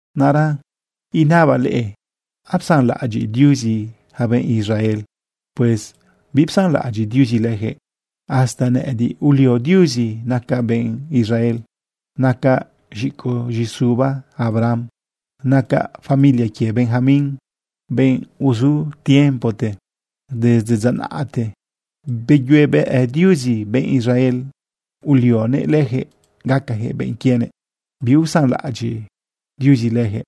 Naꞌra inabaꞌ leꞌe: ¿Apsanlaꞌadyiꞌ Diuzi yaca benꞌ Israel? Pues bipsanlaꞌadyiꞌ Diuzi leyaquëꞌ. Hasta nëꞌëdiꞌ ulio Diuzi nacaꞌ benꞌ Israel. Nacaꞌ z̃icoꞌ z̃iꞌ isuba Abraham. Nacaꞌ familia quie Benjamín, benꞌ uzu tiempote. Desde dza naꞌte beyuebëꞌ Diuzi benꞌ Israel ulionëꞌ lëjëꞌ gacajëꞌ benꞌ quienëꞌ. Biusanlaꞌadyiꞌ Diuzi leyaquëꞌ.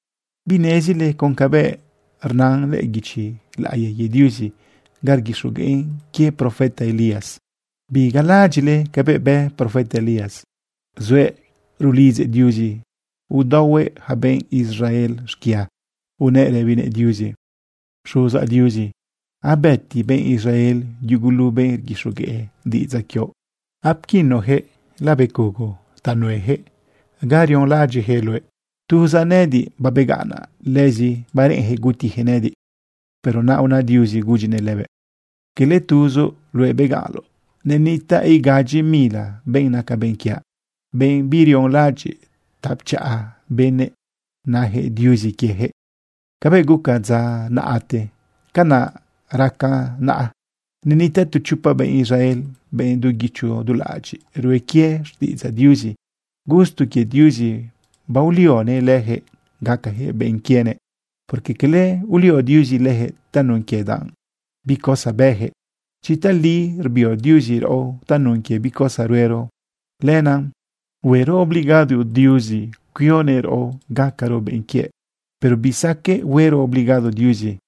¿Binezile con cabëꞌ rnan lëꞌë guichi laꞌiya quie Diuzi ga rguixogueꞌn quie profeta Elías? Bigalaꞌadyiꞌle cabëꞌ bë profeta Elías, zuëꞌ rulidzëꞌ Diuzi udaohuëꞌ yaca benꞌ Israel xquia. Unëꞌ rëbinëꞌ Diuzi: “Xuzaꞌ Diuzi, abëti benꞌ Israel yugulu benꞌ rguixogueꞌ diꞌidzaꞌ quioꞌ. Apquinuyaquëꞌ labecugo ta nueyaquëꞌ guixiꞌdaoꞌ ga rionlaꞌadyiꞌyaquëꞌ luëꞌ. Tuzaꞌ nëꞌëdiꞌ babegaꞌnaꞌ. Lëzi bareꞌenjëꞌ gutijëꞌ nëꞌëdiꞌ.” Pero naꞌ una Diuzi gudyinëꞌ lëbëꞌ: “Cala tuzoꞌ luëꞌ begaꞌnloꞌ. Nenitaꞌ igadyi mila benꞌ naca benꞌ quiaꞌ, benꞌ birionlaꞌadyiꞌ ta pchaꞌa benëꞌ najëꞌ Diuzi quiejëꞌ.” Cabëꞌ guca dza naꞌte, canaꞌ racan naꞌa. Nenitaꞌ tu chopa benꞌ Israel, benꞌ du guichi du dulaꞌadyiꞌ rue quie xtiꞌidzaꞌ Diuzi. Gusto quie Diuzi baolionëꞌ leyaquëꞌ gacajëꞌbenꞌ quienëꞌ. Porque cala ulio Diuzi lëjëꞌ tanun quie danꞌ bi cosa bëyaquëꞌ. Chi tali rbio Diuzi raꞌo tanun quie bi cosa ruero, lenaꞌ huero obligado Diuzi cuionëꞌ raꞌo gacaro benꞌ quiëꞌ. Pero bisaqueꞌ huero obligado Diuzi,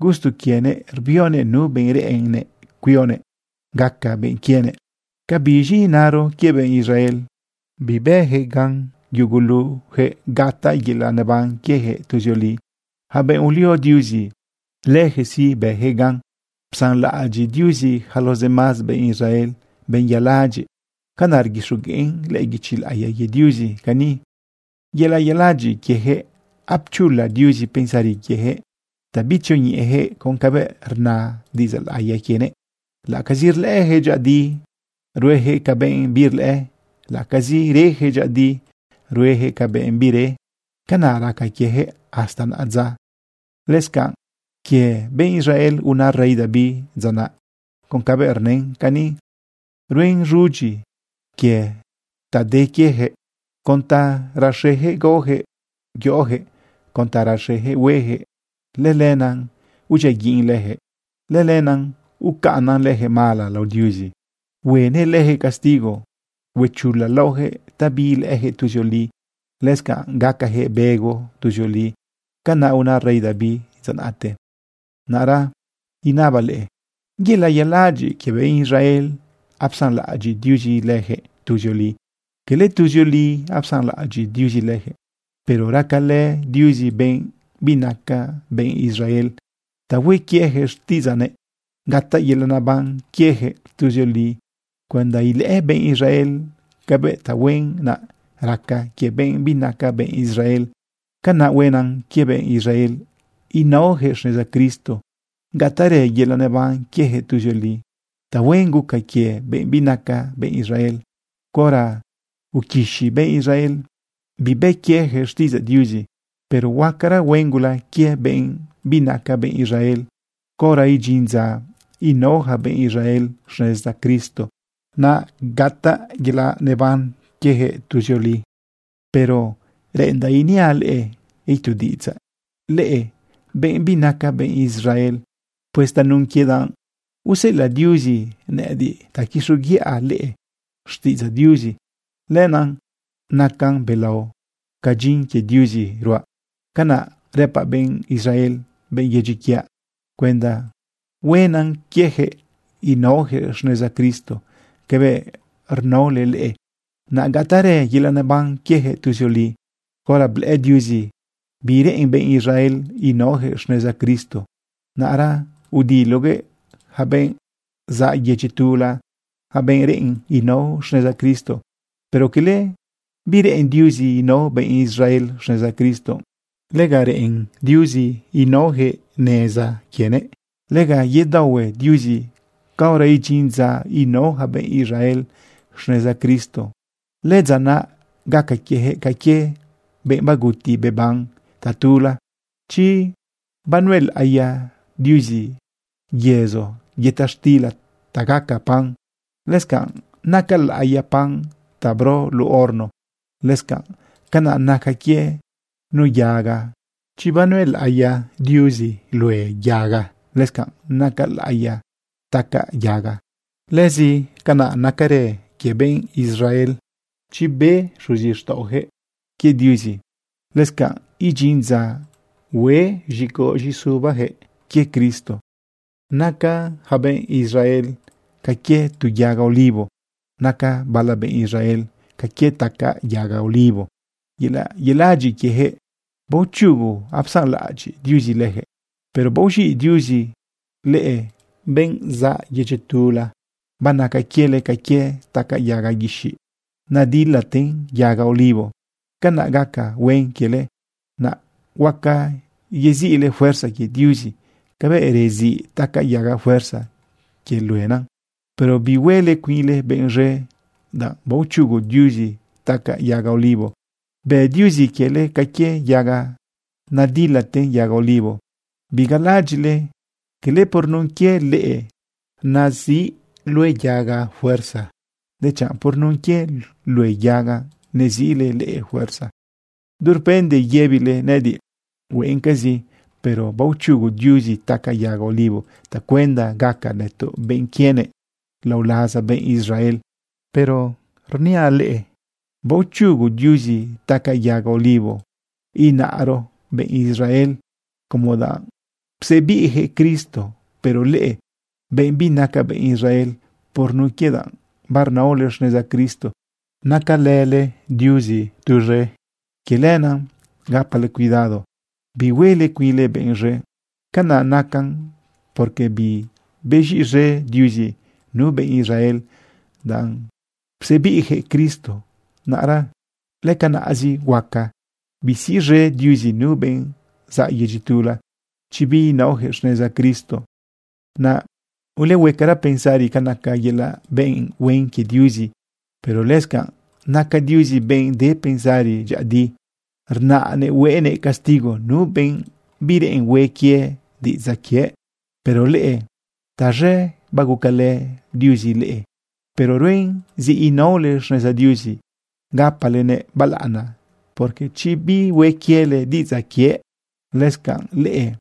gusto quienëꞌ rbionëꞌ nu benꞌ reꞌen cuionëꞌ gaca benꞌ quienëꞌ. ¿Ca biz̃i inaro quie benꞌ Israel? Bibëjëꞌ gan yugulujëꞌ gataꞌ yelaꞌ neban quiejëꞌ tuzioli. Yaca benꞌ ulio Diuzi, lëjëꞌ sí, bëjëꞌ gan. Psanlaꞌadyiꞌ Diuzi yaca los demás benꞌ Israel, benꞌ yaladyiꞌ. Canaꞌ rguixogueꞌn lëꞌë guichi laꞌiya quie Diuzi cani: “Yelaꞌ yeladyiꞌ quiejëꞌ apchula Diuzi pensari quiejëꞌ ta bitzioñeꞌejëꞌ con cabëꞌ rna diꞌidzaꞌ laꞌiya quienëꞌ. Laꞌacazi rlëꞌëjëꞌ dyëꞌëdi, ruejëꞌ ca benꞌ birlëꞌë. Laꞌacazi reyaquëꞌ dyëꞌëdi, ruejëꞌ ca benꞌ bire. Canaꞌ raca quiejëꞌ hasta naꞌadza.” Lëscanꞌ quie benꞌ Israel una rey David dza naꞌ con cabëꞌ rnën cani: Ruen z̃udyi quie ta de quiejëꞌ. Con ta raxejëꞌ gaojëꞌ yoꞌojëꞌ, con ta raxejëꞌ huejëꞌ, lëlenaꞌ udyiaguiꞌn leyaquëꞌ. Lëlenaꞌ ucaꞌnnan leyaquëꞌ mala lao Diuzi, huenëꞌ lëjëꞌ castigo. Huechula laoyaquëꞌ ta biilëꞌëyaquëꞌ tuzioli. Lëscanꞌ gacajëꞌ bego tuzioli. Canaꞌ una rey David dza naꞌte. Naꞌra inabaꞌ leꞌe: ¿Yelaꞌ yeladyiꞌ quie benꞌ Israel apsanlaꞌadyiꞌ Diuzi leyaquëꞌ tuzioli? Cala tuzioli apsanlaꞌadyiꞌ Diuzi leyaquëꞌ. Pero racalë Diuzi benꞌ binaca benꞌ Israel ta hue quieyaquëꞌ xtiꞌidzëꞌ, naꞌ gataꞌ yelaꞌ neban quiejëꞌ tuzioli cuenda ilëꞌë benꞌ Israel cabëꞌ tahuen naꞌ raca quie benꞌ binaca benꞌ Israel. Canaꞌ huenan quie benꞌ Israel ínaojëꞌ xneza Cristo gataꞌrë yelaꞌ neban quiejëꞌ tuzioli. Tahuen guca quie benꞌ binaca benꞌ Israel caora uquixi benꞌ Israel bibë quiejëꞌ xtiꞌidzaꞌ Diuzi. Pero huacara huen gula quie benꞌ binaca benꞌ Israel caora idyin dza inao yaca benꞌ Israel xneza Cristo, naꞌ gataꞌ yelaꞌ neban quiejëꞌ tuzioli. Pero reꞌendaꞌ iniaꞌ leꞌe itu diꞌidzaꞌ, leꞌe benꞌ binaca benꞌ Israel. Pues tanun quie danꞌ useꞌelaꞌ Diuzi nëꞌëdiꞌ ta quixoguiꞌa leꞌe xtiꞌidzaꞌ Diuzi, lenaꞌ nacan belao ca dyin quie Diuzi ruaꞌ. Canaꞌ rëpaꞌ benꞌ Israel, benꞌ yedyi quiaꞌ, cuenda huenan quieyaquëꞌ inaoyaquëꞌ xneza Cristo cabëꞌ rnaole leꞌe, naꞌ gataꞌrë yelaꞌ neban quiejëꞌ tuzioli. Caora blëꞌë Diuzi bireꞌen benꞌ Israel inaoyaquëꞌ xneza Cristo, naꞌra udiloguëꞌ yaca benꞌ zaꞌ yedyi tula, yaca benꞌ reꞌen inao xneza Cristo. Pero cala bireꞌen Diuzi inao benꞌ Israel xneza Cristo. Lega reꞌen Diuzi inaojëꞌ xneza quienëꞌ. Lega yedaohue Diuzi caora idyin dza inao yaca benꞌ Israel xneza Cristo. Lëdza naꞌ gaca quiejëꞌ ca quie benꞌ baguti beban tatula. Chi banuelaꞌiya Diuzi yëzo yëta xtila ta gaca pan, lëscanꞌ naca laꞌiya pan ta bro luꞌu horno. Lëscanꞌ canaꞌ nacan quie nu yaga. Chi banuelaꞌiya Diuzi lue yaga, lëscanꞌ naca laꞌiya tacaꞌ yaga. Lëscanꞌ nacarë quie benꞌ Israel. Chi bë xuzixtaꞌojëꞌ quie Diuzi, lëscanꞌ idyin dza hue z̃icoꞌ z̃iꞌisubajëꞌ quie Cristo. Naca yaca benꞌ Israel ca quie tu yaga olivo. Naca bala benꞌ Israel ca quie tacaꞌ yaga olivo. Yelaꞌ yeladyiꞌ quiejëꞌ baochugu apsanlaꞌadyiꞌ Diuzi lëjëꞌ, pero baoz̃iꞌ Diuzi leꞌe, benꞌzaꞌ yedyi tula. Banaca quiele ca quie tacaꞌ yaga guixiꞌ nadilaten yaga olivo. Canaꞌ gaca huen quiele, naꞌ huaca yeziꞌle fuerza quie Diuzi cabëꞌ reziꞌ tacaꞌ yaga fuerza quie luena. Pero bihuele cuinle benꞌ z̃e danꞌ baochugu Diuzi tacaꞌ yaga olivo, bë Diuzi quiele ca quie yaga nadilaten yaga olivo. Bigalaꞌadyiꞌle cala por nun quie leꞌe neziꞌ lue yaga fuerza, dechanꞌ por nun quie lue yaga neziꞌle leꞌe fuerza. Durpende yëbile nëꞌëdiꞌ: “Hueꞌencazi, pero baochugu Diuzi tacaꞌ yaga olivo tacuenda gaca nëtoꞌ benꞌ quienëꞌ lao laza benꞌ Israel.” Pero rëpaꞌleꞌe: “Baochugu Diuzi tacaꞌ yaga olivo, inaro benꞌ Israel, como danꞌ psebiꞌjëꞌ Cristo. Pero leꞌe, benꞌ binaca benꞌ Israel, por nun quie danꞌ barnaole xneza Cristo nacalële Diuzi tuz̃e. Quie lenaꞌ gapale cuidado bihuele cuinle benꞌ z̃e. Canaꞌ nacan porque bibez̃iꞌz̃e Diuzi nu benꞌ Israel, danꞌ psebiꞌjëꞌ Cristo. Naꞌra lëcanaꞌzi huaca bisiꞌz̃e Diuzi nu benꞌ zaꞌ yedyi tula chi biinaojëꞌ xneza Cristo. Naꞌ ulehuecara pensari ca naca yelaꞌ benꞌ huen quie Diuzi. Pero lëscanꞌ naca Diuzi benꞌ de pensari. Dyëꞌëdi rnaꞌnëꞌ huenëꞌ castigo nu benꞌ bireꞌen hue quie diꞌidzaꞌ quiëꞌ. Pero leꞌe, taz̃e bagucalë Diuzi leꞌe. Pero ruen zi inaole xneza Diuzi gapalenëꞌ balaꞌana, porque chi bihue quiele diꞌidzaꞌ quiëꞌ, lëscanꞌ leꞌe,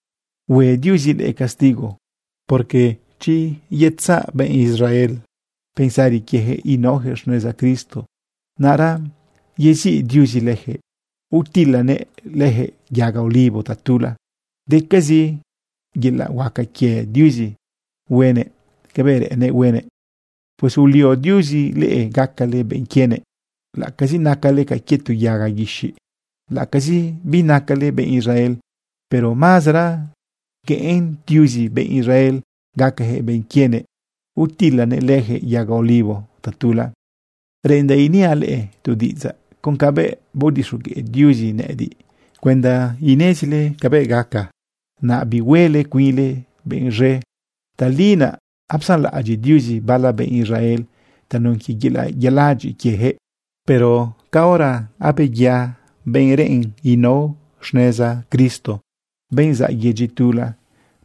hue Diuzi leꞌe castigo. Porque chi ye utzaꞌ benꞌ Israel pensari quiejëꞌ inaojëꞌ xneza Cristo, naꞌra yeziꞌ Diuzi lëjëꞌ utilanëꞌ lëjëꞌ yaga olivo tatula. Decazi yelaꞌ huaca quie Diuzi huenëꞌ cabëꞌ reꞌennëꞌ huenëꞌ. Pues ulio Diuzi leꞌe gacale benꞌ quienëꞌ, laꞌacazi nacale ca quie tu yaga guixiꞌ, laꞌacazi binacale benꞌ Israel, pero mazara gueꞌen Diuzi benꞌ Israel gacajëꞌ benꞌ quienëꞌ utilanëꞌ lëjëꞌ yaga olivo tatula. Reꞌendaꞌ iniaꞌ leꞌe tu diꞌidzaꞌ con cabëꞌ baodixogueꞌ Diuzi nëꞌëdiꞌ cuenda inezile cabëꞌ gaca, naꞌ bihuele cuinle benꞌ z̃e. Tali naꞌ apsanlaꞌadyiꞌ Diuzi bala benꞌ Israel tanun quie yelaꞌ yeladyiꞌ quiejëꞌ. Pero caora abeya benꞌ reꞌen inao xneza Cristo, benꞌ zaꞌ yedyi tula,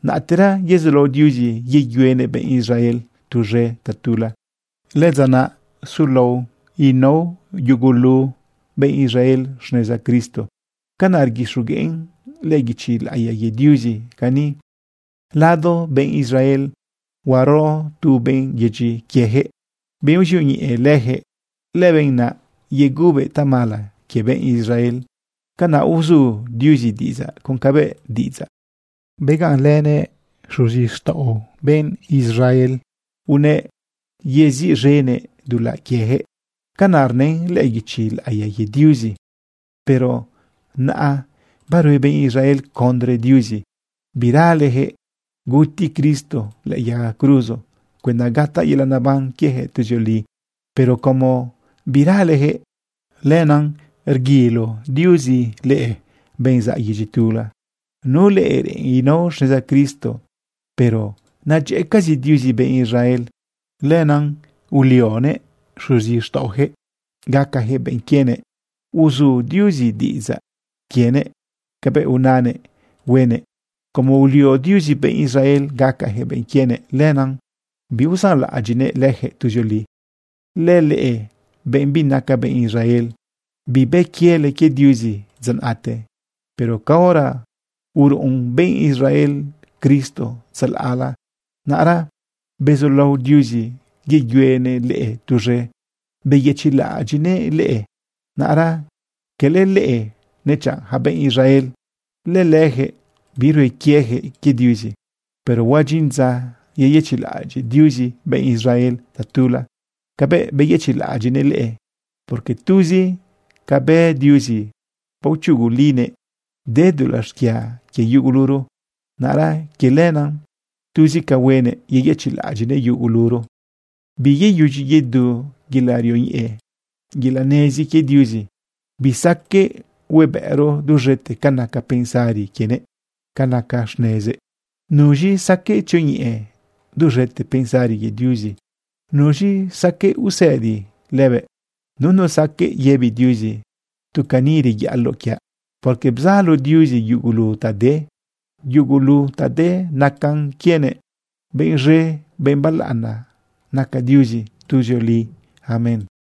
naꞌtera yezulao Diuzi yeyuenëꞌ benꞌ Israel tuz̃e tatula. Lëdza naꞌ sulao inao yugulu benꞌ Israel xneza Cristo. Canaꞌ rguixogueꞌn lëꞌë guichi laꞌiya quie Diuzi cani: Lado benꞌ Israel huaro tu benꞌ yedyi quiejëꞌ, benꞌ uzioñeꞌe lëjëꞌ. Lëbenꞌ naꞌ yegubëꞌ tamala quie benꞌ Israel. Canaꞌ uzu Diuzi diꞌidzaꞌ con cabëꞌ diꞌidzaꞌ begaꞌnlënëꞌ xuzixtaꞌo benꞌ Israel unëꞌ yeziꞌz̃enëꞌ dulaꞌ quieyaquëꞌ. Canaꞌ rnën lëꞌë guichi laꞌiya quie Diuzi. Pero naꞌa barue benꞌ Israel condre Diuzi. Biralejëꞌ guti Cristo lëꞌë yaga cruzo cuenda gataꞌ yelaꞌ neban quiejëꞌ tuzioli. Pero como biralejëꞌ, lenaꞌ rguilo Diuzi leꞌe, benꞌ zaꞌ yedyi tula, nu leꞌe reꞌen inao xneza Cristo. Pero nadyëꞌëcazi Diuzi benꞌ Israel. Lenaꞌ ulionëꞌ xuzixtaꞌojëꞌ gacajëꞌ benꞌ quienëꞌ. Uzu Diuzi diꞌidzaꞌ quienëꞌ cabëꞌ unanëꞌ huenëꞌ. Como ulio Diuzi benꞌ Israel gacajëꞌ benꞌ quienëꞌ, lenaꞌ biusanlaꞌadyiꞌnëꞌ leyaquëꞌ tuzioli. Lëleꞌe, benꞌ binaca benꞌ Israel, bibë quiele quie Diuzi dza naꞌte, pero caora uruꞌun benꞌ Israel Cristo tzalaꞌla, naꞌra bezulao Diuzi yeyuenëꞌ leꞌe tuz̃e beyëchiꞌlaꞌadyiꞌnëꞌ leꞌe. Naꞌra cala leꞌe, nechanꞌ yaca benꞌ Israel, lëleyaquëꞌ birue quiejëꞌ quie Diuzi. Pero huadyin dza yeyëchiꞌlaꞌadyiꞌ Diuzi benꞌ Israel tatula cabëꞌbeyëchiꞌlaꞌadyiꞌnëꞌ leꞌe. Porque tuzi ca bë Diuzi, baochugulinëꞌ de dulaꞌ xquia quie yuguluro. Naꞌra quie lenaꞌ tuzi ca huenëꞌ, yeyëchiꞌlaꞌadyiꞌnëꞌ yuguluro. Biyeyudyi yedu yelaꞌ rioñeꞌe, yelaꞌ nezi quie Diuzi. Bisaqueꞌ huebëꞌro duz̃ete ca naca pensari quienëꞌ, ca naca xnezëꞌ. ¿Nuz̃i saqueꞌ tzioñeꞌe duz̃ete pensari quie Diuzi? ¿Nuz̃i saqueꞌ usëdi lëbëꞌ? Nunu saqueꞌ yëbi Diuzi: “Tu cani reyaꞌaloꞌ quiaꞌ.” Porque bzalo Diuzi yugulu ta de, yelaꞌ naꞌ yugulu ta de nacan quienëꞌ. Benꞌ z̃e, benꞌ balaꞌana naca Diuzi tuzioli. Amén.